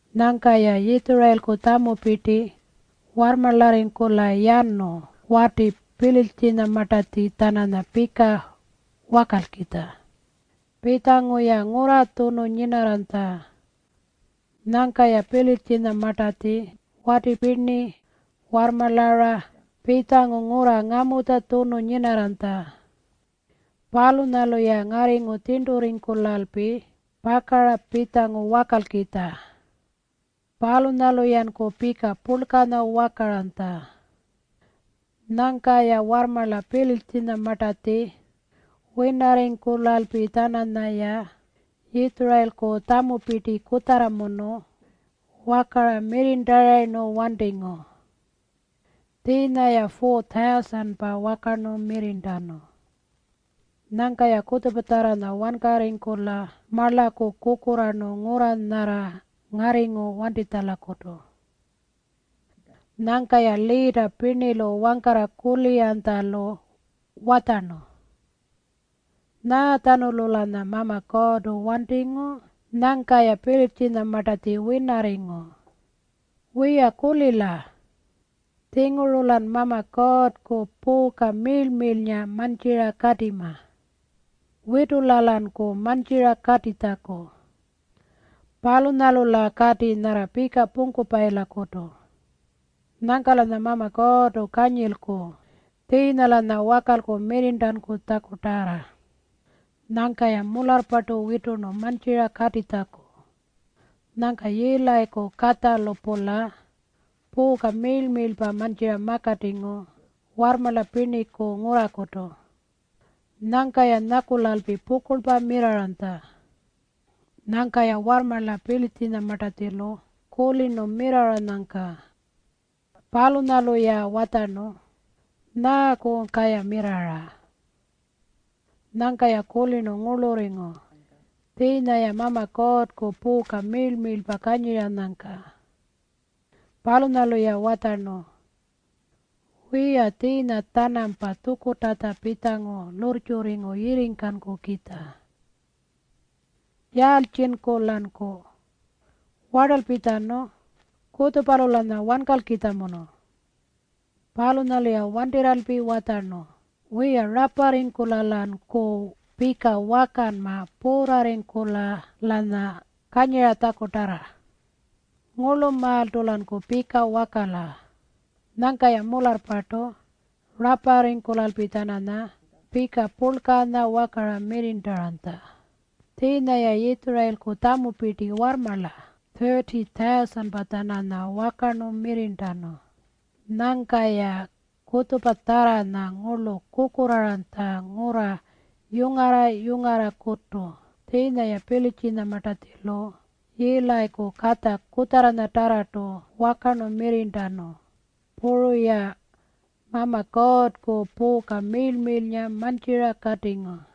Nyangka-ya Yitjurayilku tjamupirti warrmarlarringkula yanu wati Pilitjinyamartatji-tjananya pika wakalkitja. Pitjangu-ya ngurra tjunu nyinarranytja. Nyangka-ya Pilitjinyamartatji wati pirni warrmarlara pitjangu ngurra ngamutja tjunu nyinarranytja. Palunyalu-ya ngarringu tjirnturringkulalpi pakara pitjangu wakalkitja. Palunyalu-yanku pika purlkanya wakaranytja. Nyangka-ya warrmarla Pilitjinyamartatji winarringkulalpi-tjananyaya Yitjurayilku tjamupirti kutjarramunu wakara mirrirntarayirnu wantingu. Tjiinya-ya 4,000-pa wakarnu mirrirntanu. Nyangka-ya kutjupatjarranya wankarringkula marlaku kukurraarnu ngurra nyarra ngarringu wantitjalakutu. Nyangka-ya liita pirnilu wangkarra kuliranytjalu watjarnu, “Nyaatjanulu-lanya Mama Kuurrtu wantingu nyangka-ya Pilitjinyamartatji winarringu? Wiya, kulila. Tjinguru-lan Mama Kuurrku puuka miirl-miirlpa mantjira katima. Witula-lanku mantjira katitjaku. Palunyalu-la kati nyarra pika pungkupayilakutu. Nyangka-lanya Mama Kuurrtu kanyilku tjiinya-lanya wakalku mirrirntankutjakutarra.” Nyangka-ya mularrpartu witurnu mantjira katitjaku. Nyangka Yiilayiku katjalu-pula puuka miirl-miirlpa mantjira makatingu warrmarla pirniku ngurrakutu. Nyangka-ya nyakulalpi pukurlpa mirrarranytja. Nyangka-ya warrmarla Pilitjinyamartatjilu kulirnu mirrarranyangka. Palunyalu-ya watjarnu, “Nyaakunyka-ya mirrarra?” Nyangka-ya kulirnu ngurlurringu tjiinya-ya Mama Kuurrku puuka miirl-miirlpa kanyiranyangka. Palunyalu-ya watjarnu, “Wiya, tjiinya-tjanampa tjukurrtatja pitjangu lurrtjurringu yirringkankukitja. Yaaltjinku-lanku? Wartalpitjanu. Kutjupalu-lanya wankalkitjamunu.” Palunyalu-ya wantirralpi watjarnu, “Wiya, raparringkula-lanku pika wakanma puurrarringkula-lanya kanyiratjakutarra. Ngurlumaaltu-lanku pika wakala.” Nyangka-ya mularrpartu raparringkulalpi-tjananya pika purlkanya wakara mirrirntaranytja. Tjiinya-ya Yitjurayilku tjamupirti warrmarla 30,000-pa-tjananya wakarnu mirrirntanu. Nyangka-ya kutjupatjarranya ngurlu kukurraaranytja ngurra yungarra-yungarrakutu. Tjiinya-ya Pilitjinyamartatjilu Yiilayiku katja kutjarranyatarrartu wakarnu mirrirntanu. Puru-ya Mama Kuurrku puuka miirl-miirlnga mantjira katingu.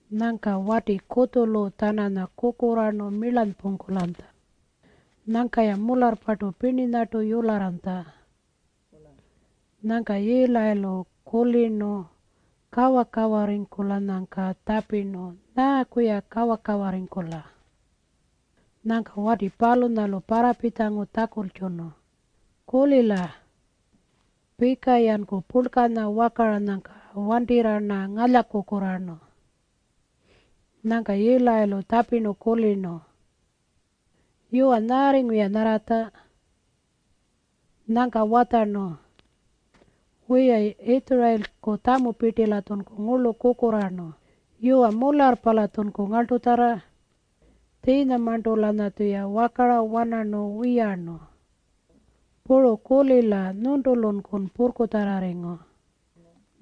Nyangka wati kutjulu-tjananya kukurraarnu milyarnpungkulanytja. Nyangka-ya mularrpartu pirninyartu yularranytja. Nyangka Yiilayilu kulirnu kawa-kawarringkulanyangka tjapirnu, “Nyaaku-ya kawa-kawarringkula?” Nyangka wati palunyalu parrapitjangu tjakultjunu, “Kulila. Pika-yanku purlkanya wakaranyangka wantirra-rna ngalyakukurraarnu.” Nyangka Yiilayilu tjapirnu, “Yuwa, nyaarringu-ya nyarratja?” Nyangka watjarnu, “Wiya, Yitjurayilku tjamupirti-latjunku ngurlu kukurraarnu. Yuwa, mularrpa-latjunku ngarltutjarra. Tjiinyamarntu-lanyatjuya wakara-wanarnu wiyarnu. Puru kulila, nyuntulunkun purrkutjarrarringu.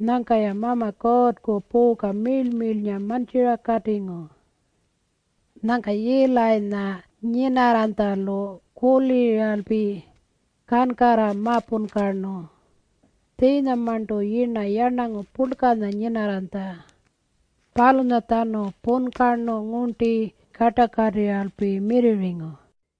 Nyangka-ya Mama Kuurrku puuka miirl-miirlnga mantjira katingu.” Nyangka Yiilayinya nyinarranytjalu kuliralpi kankarra ma-punkarnu. Tjiinyamarntu yirna yarnangu purlkanya nyinarranytja. Palunyatjanu punkarnu ngurnti kartakatirralpi mirrirringu.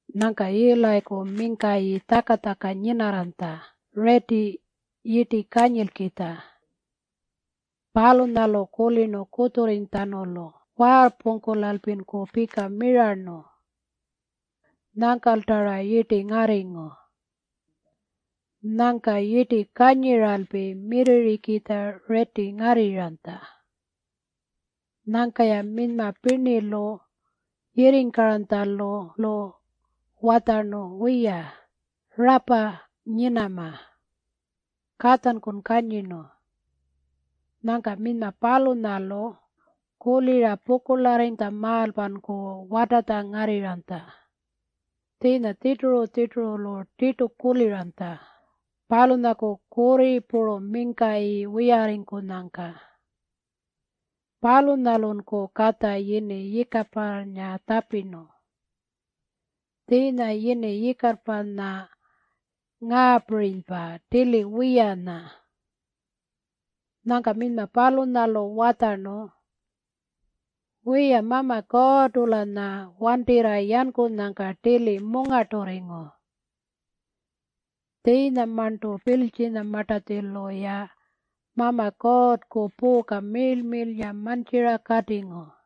Nyangka Yiilayiku mingkayi tjaka-tjaka nyinarranytja riiti yirti kanyilkitja. Palunyalu kulirnu kutjurrinytjatjanulu waarrpungkulalpinku pika mirarnu. Nyangkalta-ra yirti ngarringu. Nyangka yirti kanyiralpi mirrirrikitja riiti ngarrirranytja. Nyangka-ya minyma pirnilu yirringkaranytjalu-lu watjarnu, “Wiya, rapa nyinama. Katjankun kanyirnu.” Nyangka minyma palunyalu kulira pukurlarrinytjamaalpanku watatja ngarrirranytja. Tjiinya tjirturu-tjirturulu tirtu kuliranytja palunyaku kurri puru mingkayi wiyarringkunyangka. Palunyalunku katja yini Yikaparrnga tjapirnu. Tjiinya yini Yikaparrnga ngaapirinypa, Tili wiyanya. Nyangka minyma palunyalu watjarnu, “Wiya, Mama Kuurrtu-lanya wantirra yankunyangka tili mungarturringu. Tjiinyamarntu Pilitjinyamartatjilu-ya Mama Kuurrku puuka miirl-miirlnga mantjira katingu.”